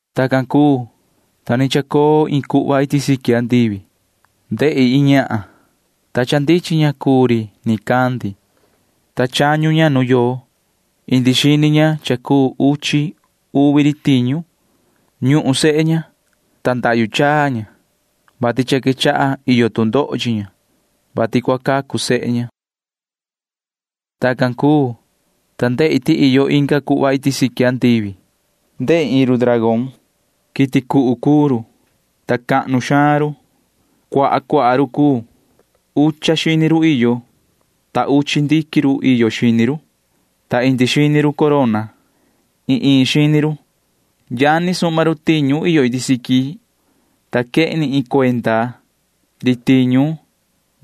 Tacan cuu, ta ni chacoo iin cuhva iti siqui andivi. Ndehi iin ñahan, ta cha ndichin ña cuu ta ri nicandi, ta chañu ña nu yoo. Indi xini ña cha cuu uchi uvi ri tiñu. Ñuhun sehe ña, ta ndahyu chaa ña, vati cha quechaha iyo tu ndoho chi ña, vati cua cacu sehe ña. Tacan cuu, ta ndehi ti iyo inga cuhva iti siqui andivi. Ndehi iin ri dragón. Quiti cuhu cuu ri, ta cahnu xaan ri. Cuaha cuaha ri cuu. Ucha xini ri iyo, ta uchi ndiquin ri iyo xini ri, ta indi xini ri corona―iin iin xini ri. Yani suhma ri tiñu iyo iti siqui savaha ri, ta quehni iin cuenda ri tiñu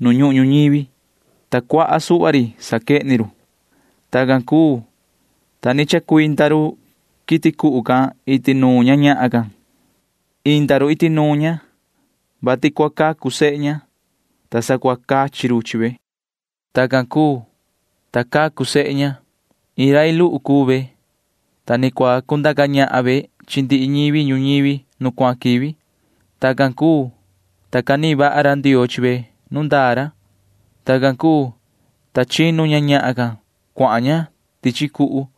nu ñuhun ñuñivi, ta cuaha suhva ri saquehni ri. Tacan cuu, ta ni chacuinda ri quiti cuhu can iti nuun ña ñahan can. Inda ri iti nuun ña, vati cua cacu sehe ña, ta sa cua cachi ri chi ve. Tacan cuu, ta cacu sehe ña. Iin rai luhu cuu ve, ta ni cua cundaca ñahan ve chi ndihi ñivi ñuñivi nu cuahan quivi. Tacan cuu, ta canihin vaha ra Ndioo chi ve nu ndaa ra. Tacan cuu, ta chinu ña ñahan can cuahan ña tichi cuhu.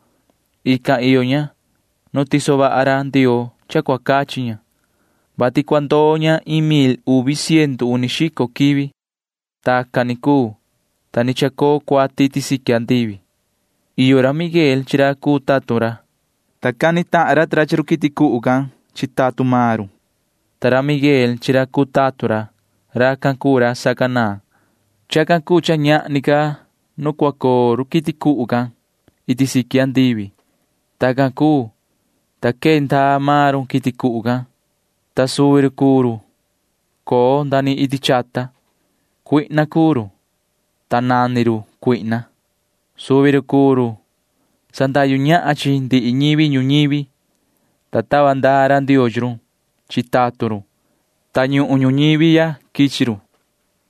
Ican iyo ña nu tiso vaha ra Ndioo cha cua cachi ña, vati cua ndoo ña iin mil uvi ciendu uni xico quivi. Tacan ni cuu, ta ni chacoo cuati iti siqui andivi. Iyo ra Miguel chi ra cuu tatun ra, ta cani tahan ra ta ra chi run quiti cuhu can chi tatun maan run, ta ra Miguel chi ra cuu tatun ra―racan cuu ra sacanaan. Chacan cuu cha ñahni ca nu cua coo ri quiti cuhu can iti siqui andivi. Tacan cuu, ta quee ndaa maan ri quiti cuhu can, ta suvi ri cuu ri coo nda ni iti chata. Cuihna cuu ri, ta nani ri Satanaa. Suvi ri cuu ri sandahyu ñahan chi ndihi ñivi ñuñivi. Tava ndaa ra Ndioo chi run chi tatun run, ta ñuhun ñuñivi ya quichi run.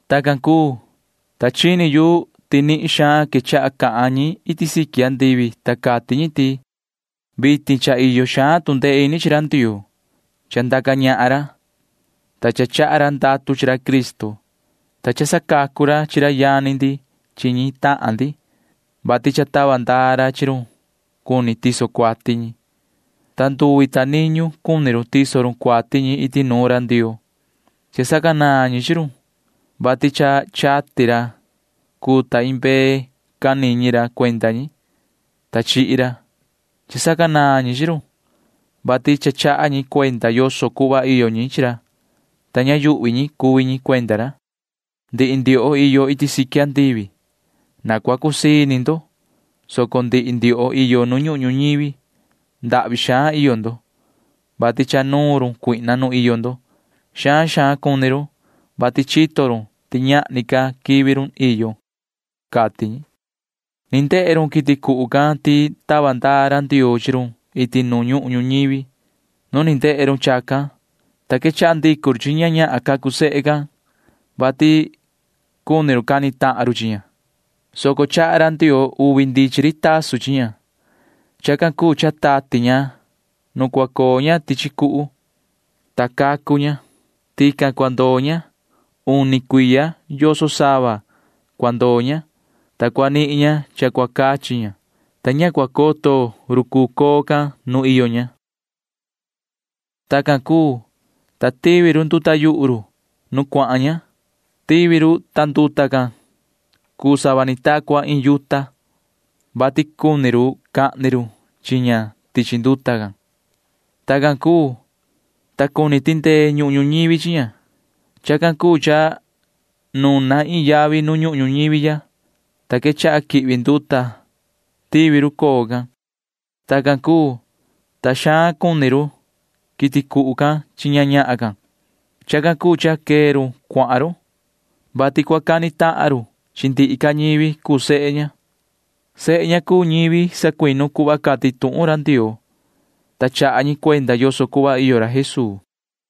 Tacan cuu, ta chini yu ti nihin xaan quechaha cahan ñi iti siqui andivi, ta cati ñi ti: ―Vitin cha iyo xaan tu ndee ini chi ra Ndioo. Cha ndaca ñahan ra, ta cha chaha ra ndatu chi ra Cristo, ta cha sacacu ra chi ra yani ndi chi ñi tahan ndi, vati cha tava ndaa ra chi run cuni tiso cuati ñi, ta nduvi ta niñu cuni run tiso run cuati ñi iti nuun ra Ndioo. Cha sacanaan ñi chi run, vati cha chati ra cuu ta iin mbee can niñi ra cuenda ñi, ta chihi ra. Cha sacanaan ñi chi run, vati cha chaha ñi cuenda yoso cuhva iyo ñi chi ra, ta ña yuhvi ñi cuvi ñi cuenda ra. Ndihi ndioho iyo iti siqui andivi―na cua cusii ini ndo, soco ndihi ndioho iyo nu ñuhun ñuñivi―ndahvi xaan iyo ndo, vati cha nuun run cuihna nu iyo ndo. Xaan xaan cuni run, vati chito run ti ñahni ca quivi run iyo ―cati ñi. Ni ndehe run quiti cuhu can ti tava ndaa ra Ndioo chi run iti nu ñuhun ñuñivi. Nu ni ndehe run chacan, ta quechaha ndicu run chi ña ñahan cacu sehe, vati cuni cani tahan run chi ña, soco chaha ra Ndioo uvi ndichin ri tasun chi ña. Chacan cuu cha tati ña nu cua coo ña tichi cuhu, ta cacu ña. Tican cua ndoo ña. Uni cuiya yoso sava cua ndoo ña, ta cua nihin ña cha cua cachi ña, ta ña cua coto ri cuu coo can nu iyo ña. Tacan cuu, ta tivi ri nduta yuhu ri nu cuahan ña. Tivi ri. Tivi ri, ta nduta can cuu sava ni ta cua iin yuta, vati cuni ri cahni ri chi ña tichi nduta can. Tacan cuu, ta cuni tindee ñuhun ñuñivi chi ña. Chacan cuu cha nuna iin yavi nu ñuhun ñuñivi ya, ta quechaha quihvi nduta tivi ri coo can. Tacan cuu, ta xaan cuni ri quiti cuhu can chi ña ñahan can. Chacan cuu cha quee ri cuahan ri, vati cua cani tahan ri chi ndihi ca ñivi cuu sehe ña. Sehe ña cuu ñivi sacuinu cuhva cati tuhun ra Ndioo, ta chaha ñi cuenda yoso cuhva iyo ra Jesuu.